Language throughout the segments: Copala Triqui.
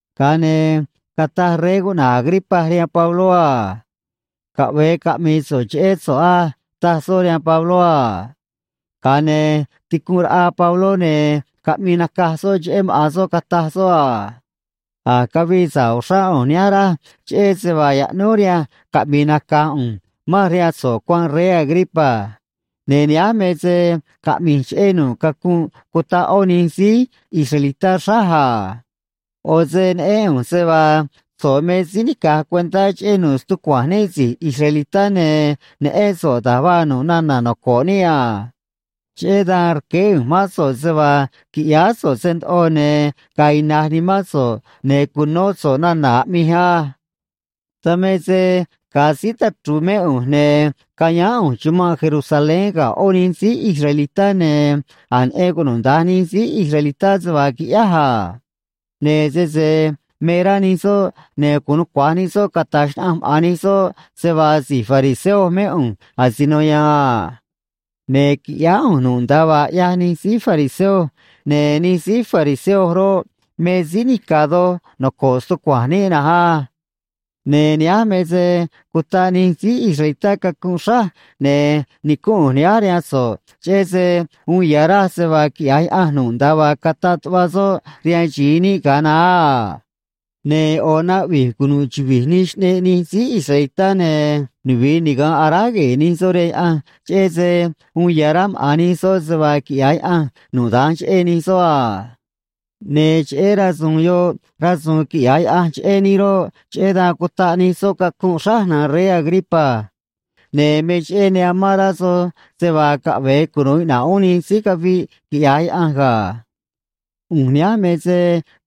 Ga̱a ne̱ cataj rey cuꞌna̱j Agripa rihaan Pabló a: ―Caꞌve̱e caꞌmi̱i̱ so̱ꞌ cheꞌé so̱ꞌ á ―taj soꞌ rihaan Pabló a. Ga̱a ne̱ ticunꞌ raꞌa Pabló, ne̱ caꞌmii nacaj soꞌ cheꞌé maꞌa̱n soꞌ, cataj soꞌ a: ―A̱j cavii sa̱ꞌ uxrá ꞌu̱nj nihánj, raj, cheꞌé se vaa yaꞌnúj rihanj caꞌmi̱i̱ nacaj ꞌu̱nj manj rihaan so̱ꞌ cuanꞌ, rey Agripa. Ne̱ nihánj me se caꞌmi̱j cheꞌé nu̱ꞌ cacunꞌ cutaꞌ ꞌó nij síí israelitá xráj a. ꞌO̱ se neꞌén ꞌu̱nj se vaa so̱ꞌ me síí nica̱j cuentá cheꞌé nu̱ꞌ stucua̱nj níꞌ si̱j israelitá, ne̱ neꞌén so̱ꞌ da̱j vaa nu̱ꞌ nana̱ noco̱ꞌ níꞌ a. Cheꞌé dan rqueé ꞌu̱nj mán so̱ꞌ se vaa qui̱ꞌyáá so̱ꞌ se ndoꞌo, ne̱ ga̱a̱ ina̱j nimán so̱ꞌ, ne̱ cu̱nó so̱ꞌ nana̱ aꞌmij á. ’Dan me se ga̱a síí tachru̱u̱ mé ꞌu̱nj, ne̱ cayáán ꞌu̱nj chumanꞌ Jerusalén ga̱ ꞌó nij síí israelitá, ne̱ a̱j neꞌen cunuda̱nj nij síí israelitá se vaa quiꞌyáj a. Ne̱ sese me rá nij soꞌ, ne̱ gu̱un nucua̱j nij soꞌ cata̱j xnaꞌanj maꞌa̱n nij soꞌ se vaa si̱j fariseo mé ꞌu̱nj asino ya̱a̱n a. Ne̱ quiꞌyáá ꞌu̱nj nu̱ꞌ nda̱a vaa ꞌyaj nij síí fariseo, ne̱ nij síí fariseo roꞌ, me síí nica̱ doj noco̱ꞌ stucua̱nj níꞌ na̱nj á. Ne̱ nihánj me se cutaꞌ nij síí israelitá cacunꞌ xráj, ne̱ nicúnꞌ ꞌu̱nj nihánj rihaan so̱ꞌ, cheꞌé se uun ya̱ raj se vaa quiꞌya̱j Yaꞌanj nu̱ꞌ nda̱a vaa cataꞌ tuꞌva soꞌ rihaan xi̱i níꞌ ga̱a naá a. Ne̱ ꞌo̱ naꞌvi̱j cunu̱ꞌ chuvi̱j nij xꞌneꞌ nij síí israelitá ne̱ nuvi̱i niga̱nꞌ aráj gue̱e̱ nij soꞌ rihaan Yaꞌanj, cheꞌé se uun ya̱ rá maꞌa̱n nij soꞌ se vaa quiꞌya̱j Yaꞌanj nu̱ꞌ da̱nj cheꞌé nij soꞌ a. Ne̱ cheꞌé rasu̱u̱n yoꞌ rasu̱u̱n quiꞌya̱j Yaꞌanj cheꞌé níꞌ roꞌ, cheꞌé dan cutaꞌ nij soꞌ cacunꞌ xráj, na̱nj rey Agripa. Ne̱ me cheꞌé ne amán rá soj se vaa caꞌve̱e cunu̱u iꞌna̱ꞌ uún nij síí caviꞌ quiꞌya̱j Yaꞌanj ga̱. ’ꞌU̱nj nihánj me se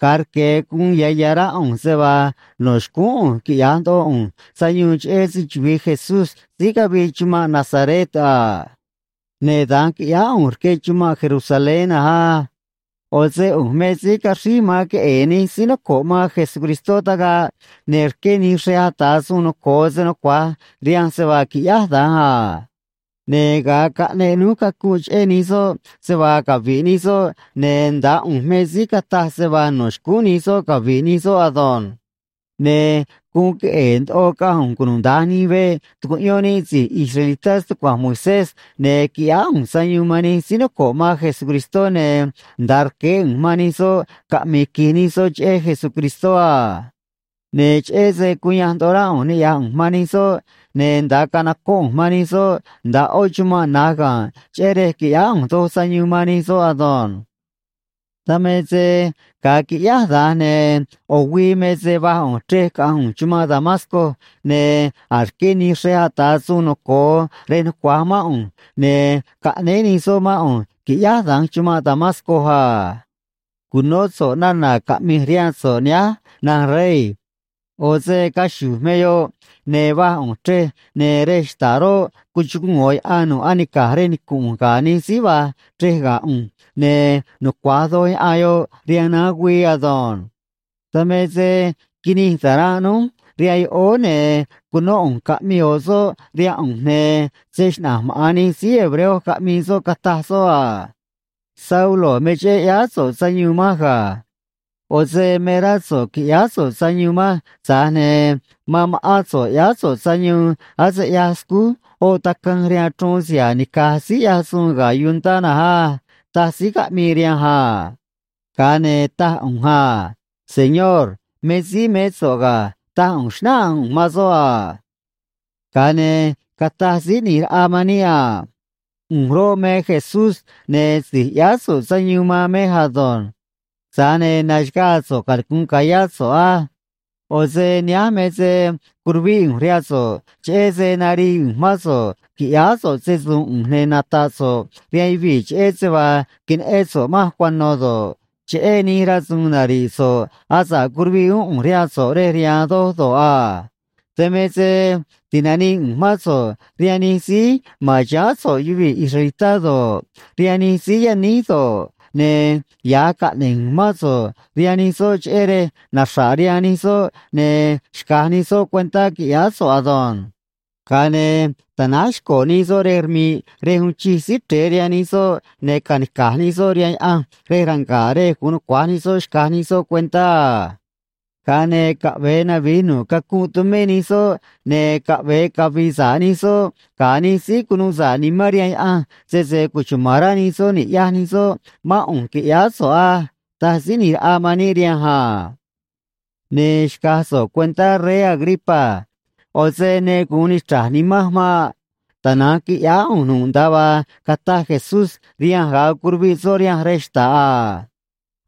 ga̱a rque̱ guun ya̱ ya̱ rá ꞌu̱nj se vaa no̱ xcúún ꞌu̱nj quiꞌya̱j ndoꞌo ꞌu̱nj sayuun cheꞌé se‑chuvi̱i Jesús síí cavii chumanꞌ Nazaret a. Ne̱ da̱nj quiꞌyáá ꞌu̱nj rque chumanꞌ Jerusalén na̱nj á. ꞌO̱ se ꞌu̱nj me síí caxríj man queꞌe̱e̱ nij síí noco̱ꞌ man Jesucristó tagaꞌ, ne̱ rqué nij xrej ata̱ suun noco̱o se nucua̱j rihanj se vaa qui̱ꞌyáj da̱nj a. Ne̱ ga̱a caꞌneꞌ núj cacunꞌ cheꞌé nij soꞌ se vaa cavi̱ꞌ nij soꞌ, ne̱ ndaá ꞌu̱nj me síí cataj se vaa no̱ xcúún nij soꞌ cavi̱ꞌ nij soꞌ ado̱nj. Ne̱ guun queꞌe̱e̱ ndoꞌo caꞌanj ꞌu̱nj cunuda̱nj nij veꞌ tucuꞌyón níꞌ si̱j israelitá stucua̱nj Moisés, ne̱ quiꞌyáá ꞌu̱nj sayuun man nij síí noco̱ꞌ man Jesucristó, ne̱ nda̱a rqueé ꞌu̱nj man nij soꞌ caꞌmi̱i̱ qui̱j nij soꞌ cheꞌé Jesucristó a. Ne̱ cheꞌé se cuyanj ndoꞌo rá ꞌu̱nj niꞌya̱j ꞌu̱nj man nij soꞌ, ne̱ nda̱a canocóꞌ ꞌu̱nj man nij soꞌ nda̱a ꞌó chumanꞌ na̱j ga̱nꞌ cheꞌé rej qui̱ꞌyáá ꞌu̱nj doj sayuun man nij soꞌ ado̱nj. ’Dan me se ga̱a quiꞌyáj da̱nj, ne̱ ꞌo̱ güii me se va̱j ꞌu̱nj chrej caꞌanj ꞌu̱nj chumanꞌ Damasco, ne̱ a̱j rqué nij xrej ata̱ suun noco̱o rej nucua̱j mán ꞌu̱nj, ne̱ caꞌnéé nij soꞌ mán ꞌu̱nj qui̱ꞌyáj da̱nj chumanꞌ Damasco a. Cu̱nó so̱ꞌ nana̱ caꞌmi̱j rihaan so̱ꞌ nihánj, na̱nj rey. ꞌO̱ se caxu̱j me yoꞌ, ne̱ va̱j ꞌu̱nj chrej, ne̱ rej xta̱ꞌ roꞌ, cuchuguu̱n ꞌo̱ yaꞌan nu̱ꞌ anica̱j rej nicu̱nꞌ ꞌu̱nj ga̱ nij síí va̱j chrej ga̱ ꞌu̱nj, ne̱ nucua̱j doj yaꞌan yoꞌ rihaan naán güii ado̱nj. Dan me se quinij ta̱ranꞌ núj rihaan yoꞌóó, ne̱ cunó ꞌu̱nj caꞌmii ꞌo̱ soꞌ rihaan ꞌu̱nj, ne̱ se‑xnaꞌa̱nj maꞌa̱n nij síí hebreo caꞌmii soꞌ, cataj soꞌ a: “Saulo, me cheꞌé ꞌyáá so̱ꞌ sayuun manj ga̱. ꞌO̱ se me rá so̱ꞌ qui̱ꞌyáá so̱ꞌ sayuun manj, tza̱j ne̱ man ma̱ꞌán so̱ꞌ ꞌyáá so̱ꞌ sayuun ase ꞌyaj scúj oꞌ tacanj rihaan chruun siha̱a̱ nica̱j síí ꞌyaj suun ga̱ yuntá na̱nj á”, taj síí caꞌmii rihanj a. Ga̱a ne̱ taj ꞌu̱nj a: “Señor, me síí mé so̱ꞌ ga̱”, taj ꞌu̱nj, xnáꞌanj ꞌu̱nj man soꞌ a. ’Ga̱a ne̱ cataj Síí ꞌNi̱j Raꞌa man níꞌ a: “ꞌU̱nj roꞌ, me Jesús, ne̱ si̱j ꞌyáá so̱ꞌ sayuun man mej ado̱nj. Tza̱j ne̱ na̱xaga̱a̱ so̱ꞌ, canicu̱nꞌ ca̱yá so̱ꞌ á. ꞌO̱ se nihánj me se curuvíꞌ ꞌu̱nj rihaan so̱ꞌ cheꞌé se narii ꞌu̱nj mán so̱ꞌ qui̱ꞌyáá so̱ꞌ se‑su̱u̱n ꞌu̱nj ne̱ nata̱ꞌ so̱ꞌ rihaan yuvii̱ cheꞌé se vaa queneꞌén so̱ꞌ manj cuano̱ do̱ꞌ, cheꞌé nij rasu̱u̱n nari̱ꞌ so̱ꞌ asa̱ꞌ curuviꞌ uún ꞌu̱nj rihaan so̱ꞌ rej riha̱a̱n doj do̱ꞌ a. Dan me se ti̱nanii ꞌu̱nj mán so̱ꞌ rihaan nij síí ma̱n chiháán so̱ꞌ yuvii̱ israelitá do̱ꞌ, rihaan nij síí yaníj do̱ꞌ, ne̱ ya̱j caꞌne̱j ꞌu̱nj mán so̱ꞌ rihaan nij soꞌ, cheꞌé rej naxra̱ꞌ rihaan nij soꞌ ne̱ xca̱j nij soꞌ cuentá qui̱ꞌyáá so̱ꞌ ado̱nj. Ga̱a ne̱ ta̱náj xco̱ nij soꞌ rej rmi̱ꞌ rej uun chij Síí Chre̱e rihaan nij soꞌ, ne̱ ca̱nica̱j nij soꞌ rihaan Yaꞌanj rej ranga̱ꞌ rej gu̱un nucua̱j nij soꞌ xca̱j nij soꞌ cuentá a. Ga̱a ne̱ caꞌve̱e navi̱j nu̱ꞌ cacunꞌ tumé nij soꞌ, ne̱ caꞌve̱e cavi̱i̱ sa̱ꞌ nij soꞌ ga̱ nij síí cunuu sa̱ꞌ nimán rihaan Yaꞌanj, sese cuchuma̱n rá nij soꞌ ni̱ꞌyaj nij soꞌ mán ꞌu̱nj, qui̱ꞌyáá so̱ꞌ á”, taj Síí ꞌNi̱j Raꞌa man níꞌ rihanj a. ’Ne̱ xca̱j so̱ꞌ cuentá, rey Agripa. ꞌO̱ se ne gu̱un nichra̱j nimanj maꞌ. Tana̱nj quiꞌyáá ꞌu̱nj nu̱ꞌ nda̱a vaa cataj Jesús rihanj ga̱a curuviꞌ soꞌ rihanj rej xta̱ꞌ a.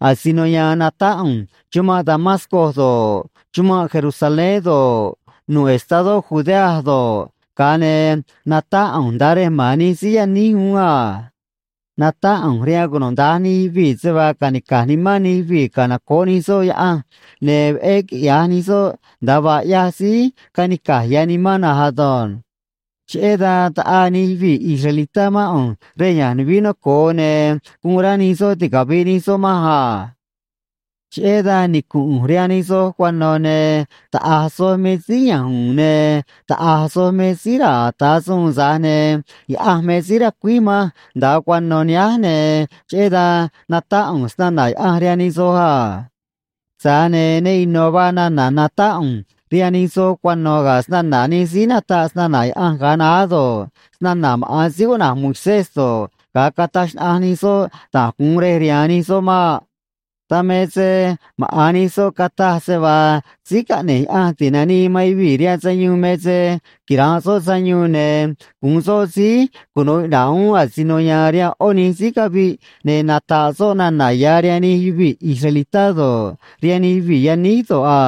Asino ya̱a̱n natáꞌ ꞌu̱nj chumanꞌ Damasco do̱ꞌ, chumanꞌ Jerusalén do̱ꞌ, nu̱ꞌ estadó Judea do̱ꞌ, ga̱a ne̱ natáꞌ ꞌu̱nj nda̱a rej ma̱n nij síí yaníj uún a. Natáꞌ ꞌu̱nj rihaan cunuda̱nj nij yuvii̱ se vaa ca̱nica̱j nimán nij yuvii̱ canoco̱ꞌ nij soꞌ Yaꞌanj, ne̱ veꞌé quiꞌya̱j nij soꞌ nda̱a vaa ꞌyaj síí canica̱j ya̱ nimán na̱nj ado̱nj. Cheꞌé dan taꞌaa nij yuvii̱ israelitá mán ꞌu̱nj rej ya̱nj nuvií noco̱o, ne̱ guun rá nij soꞌ ticavi̱ꞌ nij soꞌ manj a. ’Cheꞌé dan nicu̱nꞌ ꞌu̱nj rihaan nij soj cuano̱, ne̱ taꞌa̱j soj me síí ya̱nj u̱u̱n ne̱ taꞌa̱j soj me síí ra̱a̱ ata̱ suun, tza̱j ne̱ Yaꞌanj me síí racuíj manj nda̱a cuano̱ nihánj, ne̱ cheꞌé dan natáꞌ ꞌu̱nj snana̱ Yaꞌanj rihaan nij soj a. Tza̱j ne̱ ne ino̱ vaa nana̱ natáꞌ ꞌu̱nj rihaan nij soj cuano̱ ga̱ snana̱ nij síí nataꞌ snana̱ Yaꞌanj ga̱a naá do̱ꞌ, snana̱ maꞌa̱n síí cuꞌna̱j Moisés do̱ꞌ, ga̱a cataj xnaꞌanj nij soꞌ da̱j gu̱un rej rihaan nij soꞌ maꞌ. Dan me se maꞌa̱n nij soꞌ cataj se vaa Síí Caꞌne̱j Yaꞌanj Ti̱nanii man Yuvii̱ rihaan Sayuun me se quira̱nꞌ soꞌ sayuun, ne̱ gu̱un soꞌ síí cunuu iꞌna̱ꞌ uún asino ya̱a̱n rihaan ꞌó nij síí caviꞌ, ne̱ nata̱ꞌ soꞌ nana̱ ya̱ rihaan nij yuvii̱ israelitá do̱ꞌ, rihaan nij yuvii̱ yaníj do̱ꞌ a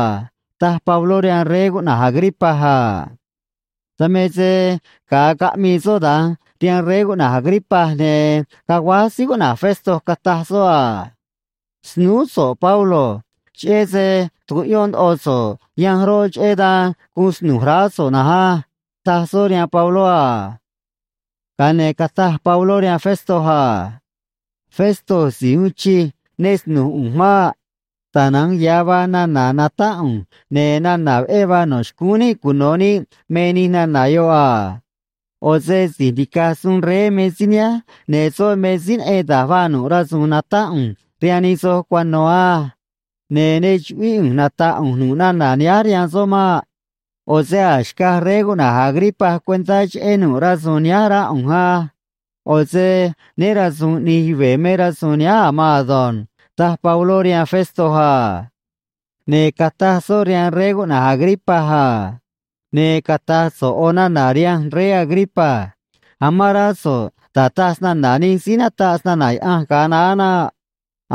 ―taj Pabló rihaan rey cuꞌna̱j Agripa a. Dan me se ga̱a caꞌmii soꞌ da̱nj rihaan rey cuꞌna̱j Agripa, ne̱ caguáj síí cuꞌna̱j Festo, cataj soꞌ a: ―Snúú so̱ꞌ, Pablo. Cheꞌé se tucuꞌyón ndoꞌo so̱ꞌ yanj roꞌ, cheꞌé dan guun snu̱j raá so̱ꞌ na̱nj á ―taj soꞌ rihaan Pabló a. Ga̱a ne̱ cataj Pabló rihaan Festo a: ―Festo si̱j uun chij, ne snu̱j ꞌu̱nj maꞌ. Tana̱nj ya̱ vaa nana̱ natáꞌ ꞌu̱nj, ne̱ nana̱ veꞌé vaa no̱ xcúún níꞌ cuno̱ níꞌ me nij nana̱ yoꞌ a. ꞌO̱ se si̱j nica̱j suun rey me síí nihánj, ne̱ soꞌ me síí neꞌen da̱j vaa nu̱ꞌ rasu̱u̱n natáꞌ ꞌu̱nj rihaan nij soj cuano̱ á. Ne̱ ne chuꞌvíꞌ ꞌu̱nj nata̱ꞌ ꞌu̱nj nu̱ꞌ nana̱ nihánj rihaan soꞌ maꞌ. ꞌO̱ se a̱j xcaj rey cuꞌna̱j Agripa cuentá cheꞌé nu̱ꞌ rasu̱u̱n nihánj, rá ꞌu̱nj á. ꞌO̱ se né ra̱su̱u̱n ꞌni̱j yuve̱ me rasu̱u̱n nihánj a̱ maan ado̱nj ―taj Pabló rihaan Festo a. Ne̱ cataj soꞌ rihaan rey cuꞌna̱j Agripa a: ―Ne̱ cata̱j so̱ꞌ ꞌo̱ nana̱ rihanj, rey Agripa. Amán rá so̱ꞌ da̱j taj snana̱ nij síí nataꞌ snana̱ Yaꞌanj ga̱a naá naꞌ.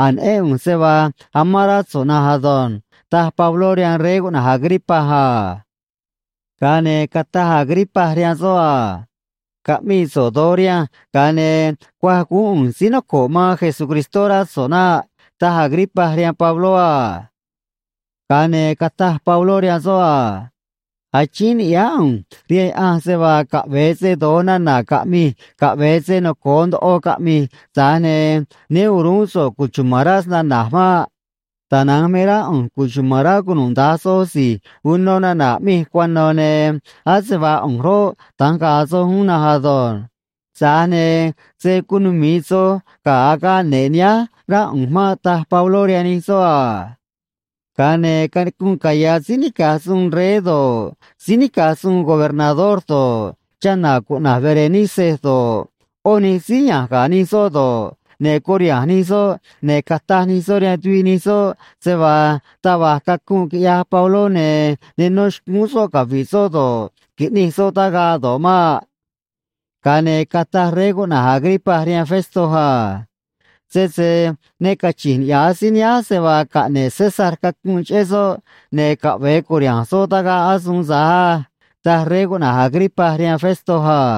A̱j neꞌén ꞌu̱nj se vaa amán rá so̱ꞌ na̱nj ado̱nj ―taj Pabló rihaan rey cuꞌna̱j Agripa a. Ga̱a ne̱ cataj Agripa rihaan soꞌ a: ―Caꞌmi̱i̱ so̱ꞌ do̱j rihanj, ga̱a ne̱ cuaj guún ꞌu̱nj síí noco̱ꞌ man Jesucristó, rá so̱ꞌ naꞌ ―taj Agripa rihaan Pabló a. Ga̱a ne̱ cataj Pabló rihaan soꞌ a: ―Achíín ni̱ꞌyáá ꞌu̱nj rihaan Yaꞌanj se vaa, caꞌve̱e se do̱j nana̱ caꞌmi̱j, caꞌve̱e se noco̱o ndoꞌo caꞌmi̱j, tza̱j ne̱ né o̱ruún so̱ꞌ cuchuma̱n rá snana̱j maꞌ. Tana̱nj me rá ꞌu̱nj cuchuma̱n rá cunuda̱nj soj si̱j uno nana̱ aꞌmij cuano̱, ne̱ ase vaa ꞌu̱nj roꞌ, da̱nj ga̱a̱ soj uún na̱nj ado̱nj. Tza̱j ne̱ se̱ cunumi̱i soj ga̱ agaꞌ ne̱ꞌ nihánj, rá ꞌu̱nj maꞌ ―taj Pabló rihaan nij soꞌ a. Ga̱a ne̱ canicunꞌ caya̱ síí nica̱j suun rey do̱ꞌ, síí nica̱j suun gobernador do̱ꞌ, chana̱ cuꞌna̱j Berenice do̱ꞌ, ꞌó nij síí ya̱nj ga̱ nij soꞌ do̱ꞌ, ne̱ curiha̱nj nij soꞌ, ne̱ cataj nij soꞌ rihaan tuviꞌ nij soꞌ se vaa taj va̱j cacunꞌ quiꞌyaj Pabló, ne̱ ne nó xcúún soꞌ cavi̱ꞌ soꞌ do̱ꞌ, qui̱ꞌnij soꞌ tagaꞌ do̱ꞌ maꞌ. Ga̱a ne̱ cataj rey cuꞌna̱j Agripa rihaan Festo a: ―Sese ne cachi̱nj niꞌya̱j síí nihánj se vaa caꞌne̱ꞌ César cacunꞌ cheꞌé soꞌ, ne̱ caꞌve̱e cu̱riha̱nj soꞌ tagaꞌ asuun tza̱j á ―taj rey cuꞌna̱j Agripa rihaan Festo a.